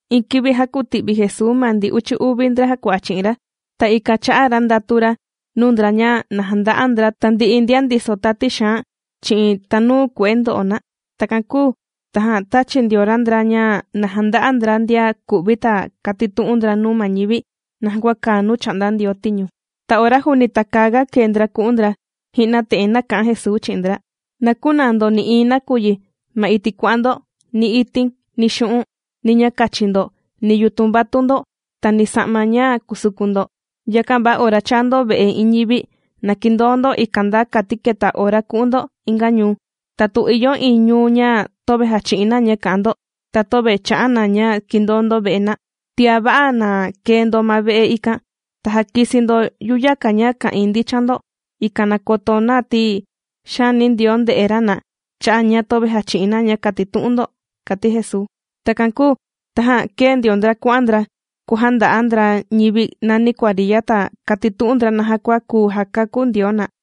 Iin kivi jākuti'vi Jesuu ma ndi uchi uvi ndra jàkua'a chi'in ra. Ta ikan chā'a ra ndatu ra nuu ndra ña na janda'a ndra tandi'i ndian ndiso tati xaan chi'in tanuu kue'e ndo'o na. Takan kūu tajan tāchi ndio ra ndra ña na janda'a ndra ndian ku'vi ta kàtitu'un ndra nuu ma ñivi naja kua kàa nuu chà'nda Ndioo tiñu. Ta ora juuni takäaga kee ndra ku'un ndra, ji'na te'en nāka'an Jesuu chi'in ndra: ―Na künaa ndo nï'iin nakuyi ma iti' kuà'an ndo: ni itin, ni xu'un', ni ña kachi ndo, ni yutun vatun ndo, ta ni ja'ma ña kùsukun ndo. Yakan va ora chaa ndo ve'e iin ñivi na kindoo ndo ikan nda kati keta ora ku'un ndo inga ñuu. Tatu ìyo iin ñuu ña töve jàchi'in na ña kà'an ndo, ta töve chà'a na ña kìndoo ndo ve'e na, tiá va'a na kee ndo ma ve'e ikan ta jakisi ndo yuyaka ña ka'ìin ndichan ndo, ikan na koto na ti xaani Ndioo ndè'e ra na chà'a ña töve jàchi'in na ña kàtitu'un ndo ―kàti Jesuu. Takan kūu tajan kēe ndio ndra kuà'an ndra kuàjanda'a ndra ñivi nani kuariya ta kàtitu'un ndra naja kua kuu jakakú Ndioo na.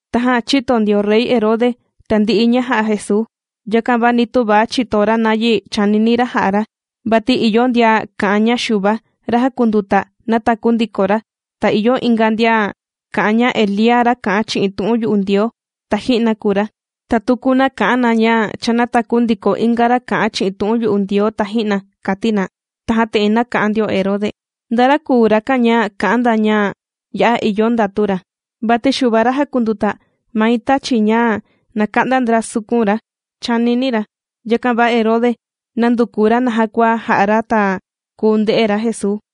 Tajan chīto ndio rey Herode tandi'i ña jà'a Jesuu. Yakan va ni töva chìto ra nayi chànini ra jà'a ra vati ìyo ndian kà'an ña Xuva, ra jàkunduta, nātaku ndiko ra, ta ìyo inga ndian kà'an ña Elía ra kà'an chi'in tu'un yu'u Ndioo taji'na kùu ra, ta tuku na kà'an na ña cha nātaku ndiko inga ra kà'an chi'in tu'un yu'u Ndioo taji'na, kàti na. Tajan te'en nāka'an ndio Herode: ―¿Nda ra kùu rakan ña kà'an na ña ya'a ìyo ndatu ra, vati Xuva ra jàkunduta, mai tāchi ña na ka'nda ndra sukun ra? ―chànini ra. Yakan va Herode nànduku ra naja kua ja'a ra ta kuu nde'e ra Jesuu.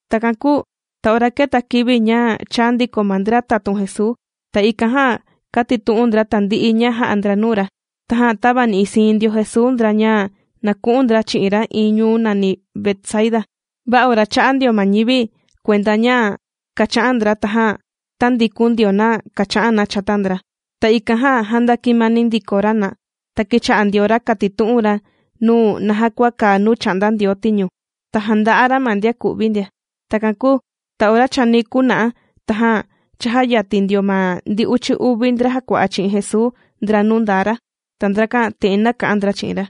Takan kūu ta ora kēta kivi ña chāa ndiko ma ndra tatun Jesuu, ta ikan jan kātitu'un ndra tandi'i ña jā'a ndra nuu ra. Tajan tāvani'i siin ndio Jesuu ndra ña na ku'un ndra chi'in ra iin ñuu nàni Betsaida. Va ora chā'a ndio ma ñivi kuenda ña kàcha'an ndra, tajan tāndikun ndio na kācha'an na chata ndra, ta ikan jan ndàkimani ndiko ra na. Ta kīcha'a ndio ra kàtitu'un ra nuu na naja kua kàa nuu chà'nda Ndioo tiñu, ta jānda'a ra ma ndian ku'vi ndia. Takan kūu ta ora chani kuna'a tajan chājayatin ndio ma ndi uchi uvi ndra jàkua'a chi'in Jesuu ndra nuu ndaa ra. Ta ndrakan te'en nāka'an ndra chi'in ra: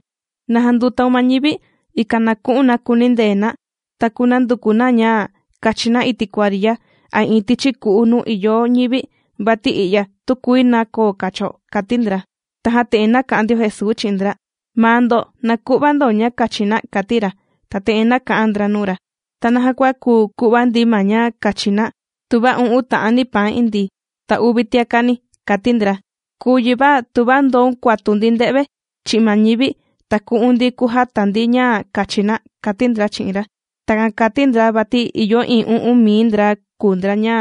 ―Na jandutáun ma ñivi, ikan na ku'un na kunindee na ta kunanduku na ña kachi na iti' kuariya a iin tichi ku'u nuu ìyo ñivi, vati i'ya tükuii na koo kacho ―kàti ndra. Tajan te'en nāka'an ndio Jesuu chi'in ndra: ―Maa ndo na ku'va ndo ña kachi na ―kàti ra. Ta te'en nāka'an ndra nuu ra: ―¿Ta naja kua kuu ku'va ndi ma ña kachi na tuva u'un ta'ani paan indii, ta uvi tiaka' ni? ―kàti ndra―. Kùu yi va tuva ndoun kuatun ndi nde've chi'in ma ñivi ta ku'un ndi kujata ndi ña kachi na ―kàti ndra chi'in ra. Takan kàti ndra vati ìyo iin u'un mii ndra kùu ndra ña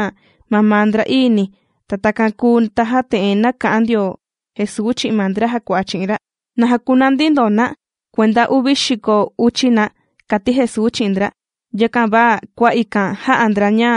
mamaa ndra'ii ni. Takan kūu tajan te'en nāka'an ndio Jesuu chi'in ma ndra jàkua'a chi'in ra: ―Na jakunandi ndo na kuenda uvi xiko uchi na ―kàti Jesuu chi'in ndra. Yakan va kua ikan jā'a ndra ña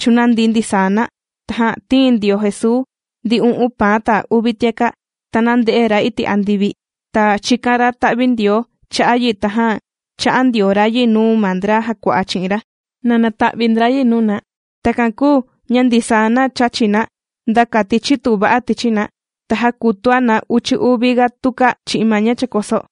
chūnandi ndisaa na. Tajan tīin ndio Jesuu ndi u'un paan ta uvi tiaka', ta nānde'e ra iti' andivi, ta chīkan ra ta'vi Ndioo cha'a' yi, tajan chā'a ndio ra yi nuu ma ndra jàkua'a chi'in ra na nata'vi ndra yi nuu na. Takan kūu ña ndisaa na chāchi na nda kati chitu va'a tichi na, ta jākutua na uchi uvi ga tuka chi'in ma ña chàkoso.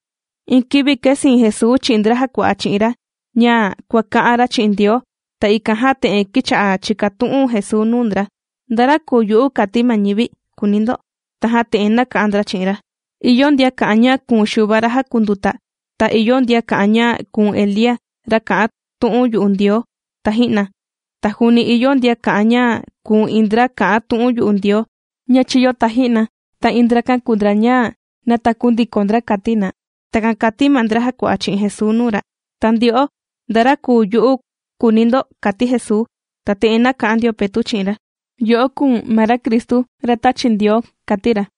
Iin kivi kēsiin Jesuu chi'in ndra jàkua'a chi'in ra ña kuàka'an ra chi'in Ndioo. Ta ikan jan te'en kīcha'a chìkatu'un Jesuu nuu ndra: ―¿Nda ra kùu yu'u kàti ma ñivi?, kùuni ndo. Tajan te'en nāka'an ndra chi'in ra: ―Ìyo ndian kà'an ña kùu̱n Xuva ra jàkunduta, ta ìyo ndian kà'an ña kùu̱n Elía, ra kà'an tu'un yu'u Ndioo taji'na, ta juuni ìyo ndian kà'an ña kùu̱n iin ndra kà'an tu'un yu'u Ndioo ña chīyo taji'na, ta iin ndrakan kùu ndra ña nātaku ndiko ndra kàti na. ―Takan kàti ma ndra jàkua'a chi'in Jesuu nuu ra. ―Ta ndyo'o, ¿nda ra kùu yu'u?, kùuni ndo ―kàti Jesuu. Ta te'en nāka'an ndio Petu' chi'in ra: ―Yo'o kùu̱n ma ra Cristu ra tāchi Ndioo ―kàti ra.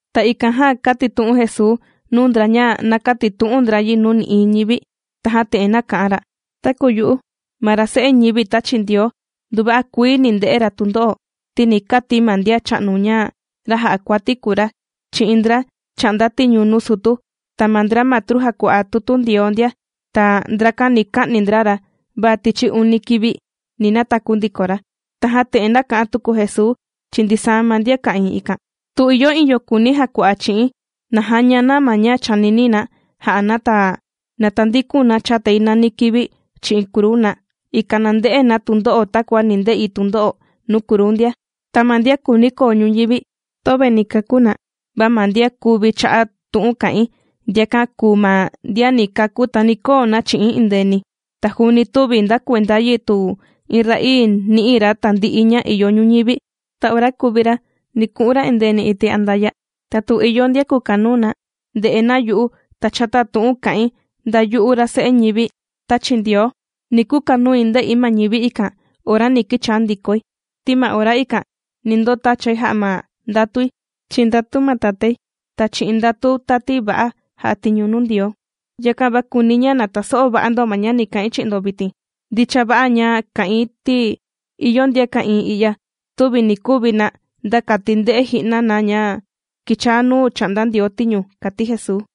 Ta ikan jan kātitu'un Jesuu nuu ndra ña na kätitu'un ndra yi nuu nï'iin ñivi. Tajan te'en kà'an ra: ―Taku yu'u ma ra Se'e ñivi tāchi Ndioo, nduva'a kuii ni nde'e ra tundo'o, ti ni kati ma ndian cha'nu ña ra jà'a kuati kùu ra, chi'in ndra chà'nda tiñu nuu sutu, ta ma ndra matru jàkua'a tutu Ndioo ndia. Ta ndrakan ni ka'ni ndra ra, va tichi uni kivi ni nataku ndiko ra. Tajan te'en nāka'an tuku Jesuu chi'in ndisaa ma ndian ka'ìin ikan: ―Tu ìyo iin yo kùuni jakua'a chi'i̱n, na jaña na ma ña chànini na ja'a na, ta na tandikun na chatai nani kivi chi'in kruu na, ikan na nde'e na tundo'o takua ni nde'i tundo'o nuu kruu ndia. Ti ma ndian kùuni koo ñuñivi, töve ni kakú na, va ma ndian kuvi cha'a' tu'un kà'in, ndiakan kùu ma ndian ni kakú ta ni koo na chi'i̱n endeeni. Ta juuni tüvi nda kuenda yi tu iin ra'ii nì'i ra tandi'i ña ìyo ñuñivi, ta ora kuvi ra, ni ku'un ra endeeni iti' andaya'. Ta tu ìyo ndian kùkanuu na nde'e na yu'u ta chata tu'un kà'in, nda yu'u ra Se'e ñivi tāchi Ndioo, ni kukanui nde'i ma ñivi ikan ora ni kichaa ndikoi. Ti ma ora ikan ni ndotachai jà'a ndatui chi'in ndatu ma Tatái ta chi'in ndatu tati va'a jà'a tiñu nuu Ndioo. Yakan va kùuni̱ ña taso'o va'a ndo ma ña ni ka'in chi'in ndo vitin. Ndicha va'a ña kà'in ti ìyo ndian ka'ìin i'ya tüvi ni kuvi na nda kati nde'e ji'na na ña kichaa nuu chà'nda Ndioo tiñu ―kàti Jesuu.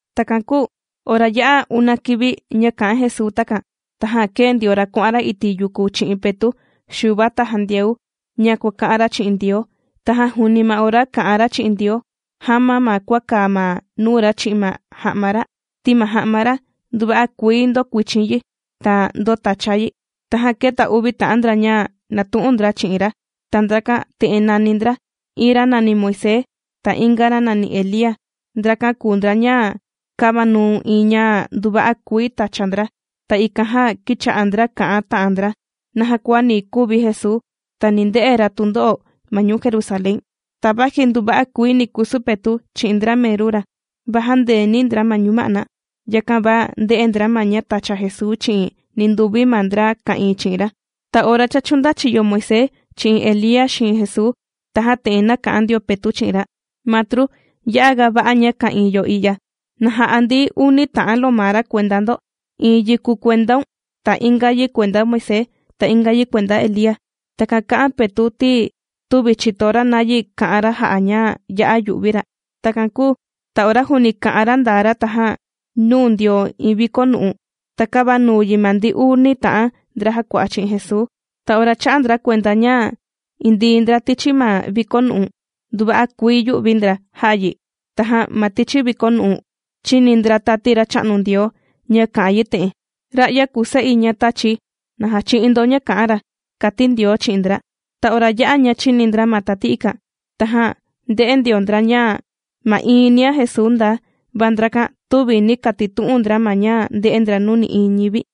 Takan kūu ora ya'a una kivi ña kā'an Jesuu takan, tajan kēe ndio ra kuà'an ra iti' yuku chi'in Petu', Xuva ta Jandiau ña kuàka'an ra chi'in Ndioo. Tajan juuni ma ora kà'an ra chi'in Ndioo, jāma ma kua kàa ma nuu ra chi'in ma ja'ma ra, ti ma ja'ma ra nduva'a kuii ndōkuichin yi ta ndōtacha yi. Tajan kēta uvi ta'an ndra ña nàtu'un ndra chi'in ra. Ta ndrakan te'en nàni ndra: iin ra nàni Moisés ta inga ra nàni Elía. Ndrakan kùu ndra ña kāvanuu iin ña nduva'a kuii tàcha ndra. Ta ikan jan kīcha'a ndra kà'an ta'an ndra naja kua ni kuvi Jesuu ta ni nde'e ra tundo'o ma ñuu Jerusalén. Ta vaji nduva'a kuii ni kusu Petu' chi'in ndra meru ra, va jāndeeni ndra ma ñuma'na. Yakan va ndē'e ndra ma ña tàcha Jesuu chi'in ninduvi ma ndra ka'ìin chi'in ra. Ta ora cha chūndachiyo Moisés chi'in Elía xiin Jesuu, tajan te'en nāka'an ndio Petu' chi'in ra: ―Matru, ya'aga va'a ña ka'ìin yo i'ya. Na ja'a ndi uni ta'an lomara kuenda ndo: iin yi kùu kuendaun ta inga yi kuenda Moisés ta inga yi kuenda Elía. ―Takan kà'an Petu' ti ni tüvi chìto ra nayi kà'an ra jà'a ña ya'a yū'vi ra. Takan kūu ta ora juuni kà'an ra ndaa ra tajan nūu ndio iin vikonu'u ta kāvanuu yi ma ndi uni ta'an ndra jàkua'a chi'in Jesuu. Ta ora chā'a ndra kuenda ña indii ndra tichi ma vikonu'u, nduva'a kuii yū'vi ndra jā'a yi. Tajan ma tichi vikonu'u chīni ndra tati Racha'nu Ndioo ña kà'an yi te'en: ―Ra'ya kùu Se'i ña tāchi̱. ¡Na jachi'in ndo ña kà'an ra! ―kàti Ndioo chi'in ndra. Ta ora yā'a ña chìni ndra ma tati ikan, tajan ndē'e ndio ndra ña ma'iin nia Jesuu ndaa. Va ndrakan tüvi nī katitu'un ndra ma ña ndē'e ndra nuu nï'iin ñivi.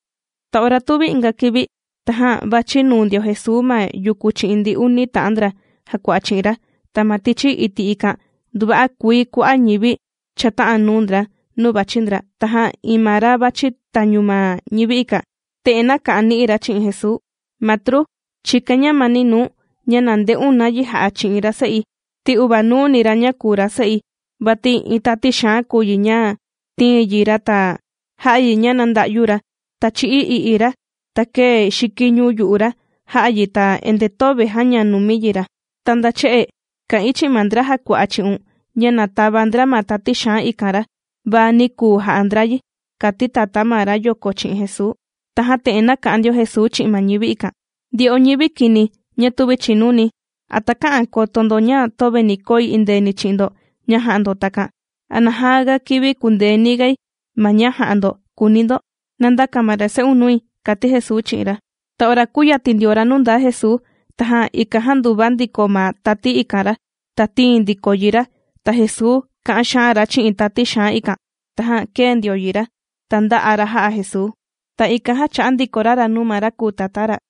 Ta ora tuvi inga kivi, tajan vàchi nuu ndio Jesuu ma yuku chi'in ndi uni ta'an ndra jàkua'a chi'in ra. Ta ma tichi iti' ikan nduva'a kuii kua'a' ñivi chāta'an nuu ndra nuu vàchi ndra. Tajan iin ma ra vàchi tañu ma ñivi ikan, te'en nāka'an ni'i ra chi'in Jesuu: ―Matru, chìkain ñamani nuu̱n ña na nde'un nayi jà'a chi'in ra se'i, ti uvanuuni ra ña kùu ra se'i. Vati iin tati xaan kùu yi ña tìin yi ra ta jà'a yi ña na nda'yu ra, ta chì'i i'i ra, ta kèe xikiñu yu'u ra jà'a yi ta endee töve jàña numi yi ra. Ta nda che'e kā'in chi'in ma ndra jàkua'a chi'un ña na tava ndra ma tati xaan ikan ra, va nī kuu ja'a ndra yi ―kàti tatá ma rayoko chi'in Jesuu. Tajan te'en nāka'an ndio Jesuu chi'in ma ñivi ikan: ―¡Ndyo'o ñivi kini ña tüvi chìnuni! ¿A takä'an koto ndo ña töve ni koi endeeni chi'in ndo ña jà'a ndo takan? ¿A naja ga kivi kùndeeni gai ma ña jà'a ndo?, kùuni ndo. ¡Nandaka ma ra se'un nui! ―kàti Jesuu chi'in ra. Ta ora kūyatin ndio ra nuu ndaa Jesuu, tajan ikan jānduva ndiko ma tati ikan ra, ta tīin ndiko yi ra. Ta Jesuu kā'an xaan ra chi'in tati xaan ikan, tajan kēe ndio yi ra, ta ndā'a ra jā'a Jesuu. Ta ikan jan chā'a ndiko ra ra nuu ma ra kùu tatá ra.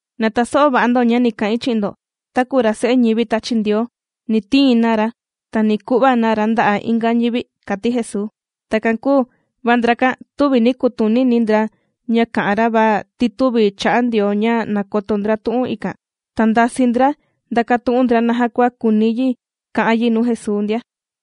―Na taso'o va'a ndo ña ni ka'in chi'in ndo: taku ra Se'e ñivi tāchi Ndioo ni tiin na ra, ta ni ku'va na ra nda'a' inga ñivi ―kàti Jesuu. Takan kūu va ndrakan tüvi nī kutunini ndra ña kā'an ra, vati tüvi chà'a Ndioo ña na koto ndra tu'un ikan. Ta ndasii ndra ndakatu'un ndra naja kua kùuni yi ka'an yi nuu Jesuu ndia.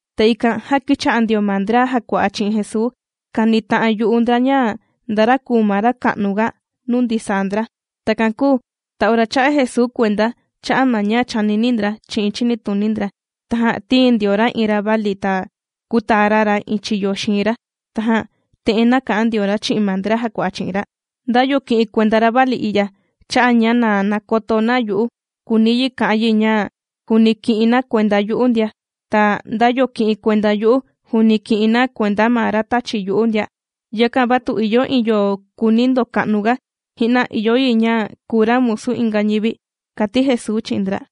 Ta ikan jan kīcha'a ndio ma ndra jàkua'a chi'in Jesuu kànita'an yu'u ndra ña nda ra kùu ma ra ka'nuga nuu ndisaa ndra. Takan kūu ta ora chā'a Jesuu kuenda cha'a' ma ña chànini ndra chi'in chinituni ndra, tajan tīin ndio ra iin ravali ta kūtaa ra ra iin chiyo xiin ra, tajan te'en nāka'an ndio ra chi'in ma ndra jàkua'a chi'in ra: ―Nda yo kì'in kuenda ravali i'ya cha'a' ña nakoto na yu'u, kùuni yi ka'an yi ña juuni kì'in na kuenda na yu'u ndia. Ta nda yo kì'in kuenda yu'u juuni kì'in na kuenda ma ra tāchi yu'u ndia. Yakan va tu ìyo iin yo kùuni ndoka'nuga, ji'na ìyo yi ña kuu ra musu inga ñivi ―kàti Jesuu chi'in ndra.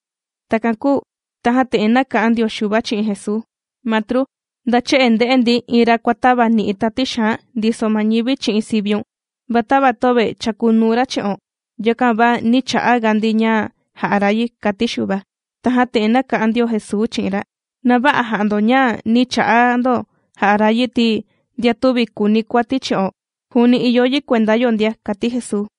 Takan kūu tajan te'en nāka'an ndio Xuva chi'in Jesuu: ―Matru, nda che'e ndē'e ndi iin ra kùatavani'i tati xaan ndiso ma ñivi chi'in siviun, va tava töve chàkunuu ra chi'o, yakan va nī cha'a ga ndi ña jà'a ra yi ―kàti Xuva. Tajan te'en nāka'an ndio Jesuu chi'in ra: ―Na vä'a jà'a ndo ña nī cha'a ndo jà'a ra yi ti ndian tüvi kùuni kuati chi'o, juuni ìyo na kuenda yo ndia ―kàti Jesuu.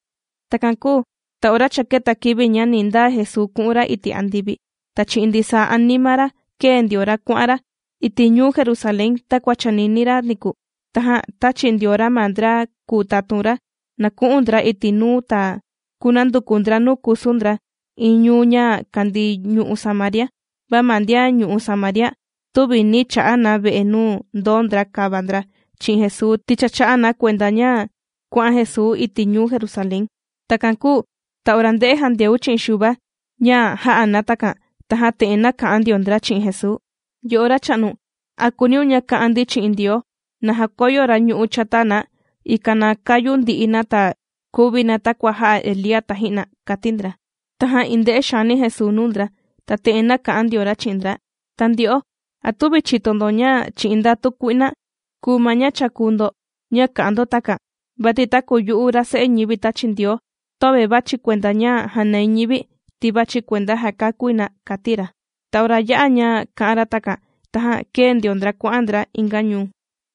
Takan kūu ta ora cha kēta kivi ña ni ndaa Jesuu ku'un ra iti' andivi, ta chi'in ndisaa anima ra kēe ndio ra kuà'an ra iti' ñuu Jerusalén takua chànini ra niku. Tajan tāchi ndio ra ma ndra kùu tatun ra na ku'un ndra iti' nuu ta kunanduku ndra nuu kusu ndra iin ñuu ña kàndii ñu'u' Samaria. Va ma ndian ñu'u' Samaria tüvi nī cha'a na ve'e nuu ndoo ndra kava ndra chi'in Jesuu, ti cha chā'a na kuenda ña kuà'an Jesuu iti' ñuu Jerusalén. Takan kūu ta ora ndē'e Jandiau chi'in Xuva ña jā'a na takan, tajan te'en nāka'an ndio ndra chi'in Jesuu: ―Yo'o Racha'nu, ¿a kùuniun ña ka'an ndi chi'in Ndioo na jakoyo ra ñu'ú chata na, ikan na kayu ndi'i na ta kuvi na takua jā'a Elía taji'na? ―kàti ndra. Tajan iin nde'e xaani Jesuu nuu ndra, ta te'en nāka'an ndio ra chi'in ndra: ―Ta ndyo'o, ¿a tüvi chìto ndo ña chi'in ndatu kui'na kùu ma ña chàkuu ndo ña kā'an ndo takan? Vati taku yu'u ra Se'e ñivi tāchi Ndioo, töve vàchi̱ kuenda ña jànai ñivi ti vàchi̱ jakakúi na ―kàti ra. Ta ora yā'a ña kā'an ra takan, tajan kēe ndio ndra kuà'an ndra inga ñuu.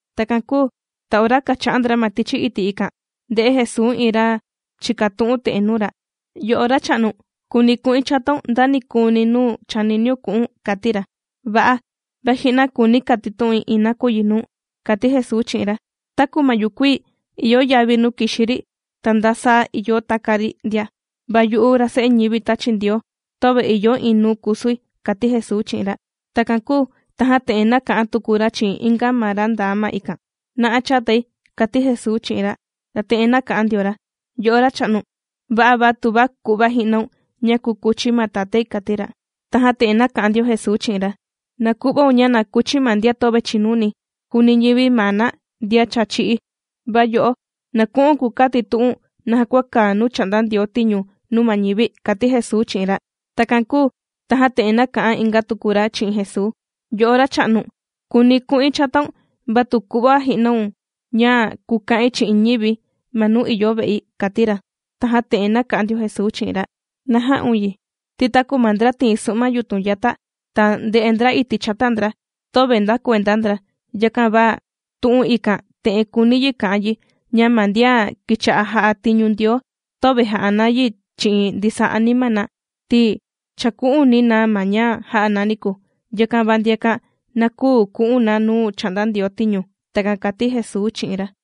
Takan kūu ta ora kàcha'an ndra ma tichi iti' ikan, ndē'e Jesuu iin ra chìkatu'un te'en nuu ra: ―Yo'o Racha'nu, kùuni̱ ku'in chataun nda nikuuni nuu chàniniun ku'u̱n ―kàti ra. ―Va'a, va ji'na kùuni̱ katitu'in iin nakuyi nuu̱n ―kàti Jesuu chi'in ra―. Taku ma yukuii ìyo yavi nuu kìxi ri ta nda saa ìyo taka ri ndia, va yu'u ra Se'e ñivi tāchi Ndioo töve ìyo iin nuu kusui ―kàti Jesuu chi'in ra. Takan kūu tajan te'en nāka'an tuku ra chi'in inga ma ra ndaa ma ikan: ―¡Na'a chatai! ―kàti Jesuu chi'in ra. Ta te'en nāka'an ndio ra: ―Yo'o Racha'nu, va'a va tuva ku'va ji'naun ña kukuchi̱ ma tatái ―kàti ra. Tajan te'en nāka'an ndio Jesuu chi'in ra: ―Na ku'vaun ña na kuchi ma ndian töve chìnuni juuni ñivi maa na ndian cha chī'í, va yo'o na ku'u̱n kukatitu'u̱n naja kua kàa nuu chà'nda Ndioo tiñu nuu ma ñivi ―kàti Jesuu chi'in ra. Takan kūu tajan te'en nāka'an inga tuku ra chi'in Jesuu: ―Yo'o Racha'nu kùuni ku'in chataun va tu ku'va ji'naun ña kuka'in chi'in ñivi̱ ma nuu ìyo ve'i ―kàti ra. Tajan te'en nāka'an ndio Jesuu chi'in ra: ―Na jä'un yi, ti taku ma ndra tìin su'ma yutun yata, ta ndè'e ndra iti' chata ndra, töve nda kuenda ndra. Yakan va ma tu'un ikan te'en kùuni yi ka'an yi ña ma ndian kīcha'a jà'a tiñu Ndioo, töve jà'a na yi chi'in ndisaa anima na, ti chàku'uni na ma ña jā'a na niku. Yakan va ndiakan na küu ku'un na nuu chà'nda Ndioo tiñu. ―Takan kàti Jesuu chi'in ra.